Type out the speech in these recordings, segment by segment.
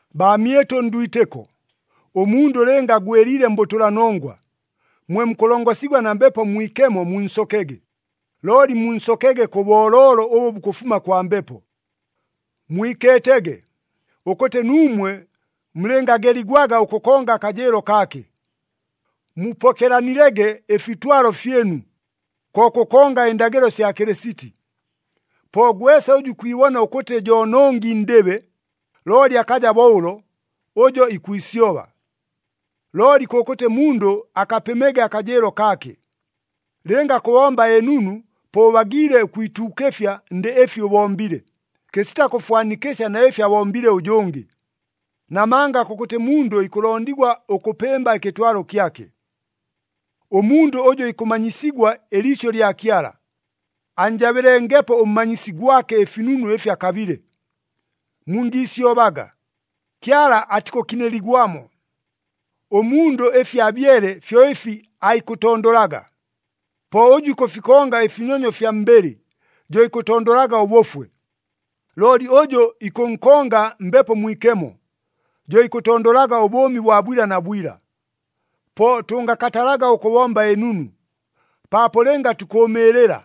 Baamyɨtʉ ndwitɨko, ʉmundʉ lɨnga agwɨliile mbʉtʉlanongwa, mwe mukʉlongosigwa na Mbepo Mwikemo munsokege, looli munsokege kʉ booloolo ʉbʉ bukʉfuma kwa Mbepo. Mwikeetege, ʉkʉtɨ nuumwe mulɨngageligwaga ʉkʉkonga akajɨɨlo kaake. Mupokelanilege ɨfitwalo fyɨnu, ko kʉkonga ɨndagɨlo sya Kɨlɨsiti. Po gwesa ʉjʉ ikwibona ʉkʉtɨ jo nongi ndɨbe, looli akaja bo ʉlo, ʉjo ikwisyoba. Looli kʉkʉtɨ mundʉ akapɨmege akajɨɨlo kaake. Lɨnga kʉbomba ɨnunu, po ʉbagiile ʉkwituukɨfya ndɨ ɨfi ʉbombile, kɨsita kʉfwanikɨsya na ɨfi abombile ʉjʉngɨ. Namanga kʉkʉtɨ mundʉ ikʉlondigwa ʉkʉpɨmba ɨkɨtwalo kyake. Ʉmundʉ ʉjʉ ikʉmanyisigwa ɨliisyʉ lya Kyala, annjabɨlengepo ʉmmanyisi gwake ɨfinunu ɨfi akabile. Mungiisyobaga, Kyala atikʉkɨnɨligwamo. Ʉmundʉ ɨfi abyele, fyo ɨfi aikʉtondolaga. Po ʉjʉ ikʉfikonga ɨfinyonyo fya mbɨlɨ, jo ikʉtondolaga ʉbʉfwe. Looli ʉjʉ ikʉnkonga Mbepo Mwikemo, jo ikʉtondolaga ʉbʉʉmi bwa bwila na bwila. Po tʉngakatalaga ʉkʉbomba ɨnunu, paapo lɨnga tukʉʉmɨɨlɨla,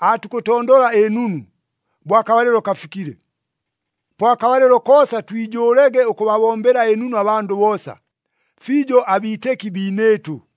aatukʉtondola ɨnunu, bo akabalɨlo kafikile. Po akabalɨlo koosa twijʉʉlege ʉkʉbabombela ɨnunu abandʉ boosa, fiijo abiitɨki biinɨɨtʉ.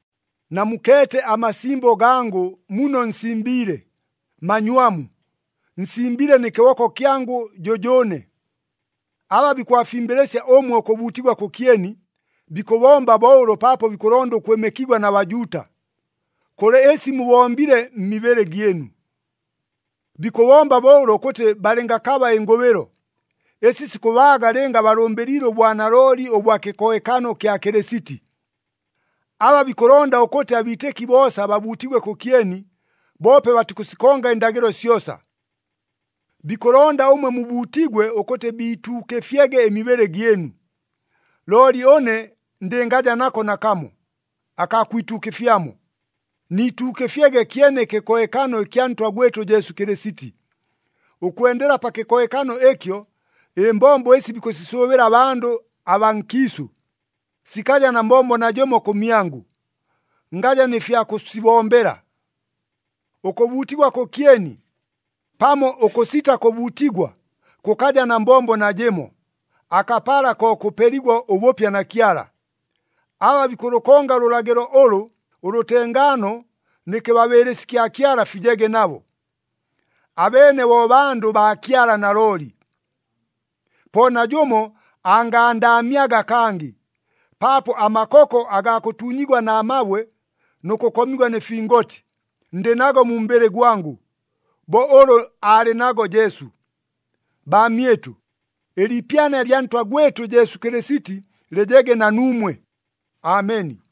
Namukeete amasimbo gangʉ muno nsimbiile, manywamu. Nsimbile nɨ kɨboko kyangʉ jʉjʉʉne. Aba bikʉbafimbɨlɨsya ʉmwe ʉkʉbuutigwa kʉkyeni, bikʉbomba bo ʉlo paapo bikʉlonda ʉkwɨmɨkigwa na Bajuuta, kʉlɨ ɨsi mubombile mmibɨlɨ gyɨnu. Bikʉbomba bo ʉlo ʉkʉtɨ balɨngakaba ɨngʉbɨlo, ɨsi sikʉbaaga lɨnga balʉmbɨliile ʉbwanalooli ʉbwa kɨkohekano kya Kɨlɨsiti. Aba bikʉlonda ʉkʉtɨ abiitɨki boosa babuutigwe kʉkyeni, boope batikʉsikonga ɨndagɨlo syosa. Bikʉlonda ʉmwe mubuutigwe ʉkʉtɨ biituukɨfyege ɨmibɨlɨ gyɨnu. Looli ʉne ndɨngajaga nako nakamo, akaa kwituukɨfyamo, nituukɨfyege kyene ɨkɨkohekano ɨkya Ntwa gwɨtʉ Jesu Kɨlɨsiti. Ʉkwendela pa kɨkohekano ɨkyo, ɨmbombo ɨsi bikʉsisʉʉbɨla abandʉ abaa nkiisʉ, sikaja na mbombo najɨmo kʉmyangʉ, ngaja nɨ fya kʉsibombela. Ʉkʉbuutigwa kʉkyeni pamo ʉkʉsita kʉbuutigwa kʉkaja na mbombo najɨmo, akapala ko kʉpeligwa ʉbʉpya na Kyala. Aba bikʉlʉkonga ʉlʉlagɨlo ʉlʉ, ʉlʉtengaano nɨ kɨbabɨɨlɨsi kya Kyala fijege nabo. Abeene bo bandʉ baa Kyala nalooli. Po najʉmo angandaamyaga kangɨ, paapo amakoko agaa kʉtuunyigwa na mabwe nʉ kʉkomigwa nɨ fingoti, ndɨ nago mu mbɨlɨ gwangʉ, bo ʉlʉ aalɨ nago Jesu. Baamyɨtʉ, ɨliipyana lya Ntwa gwɨtʉ Jesu Kɨlɨsiti lɨjege na nuumwe. Ameni.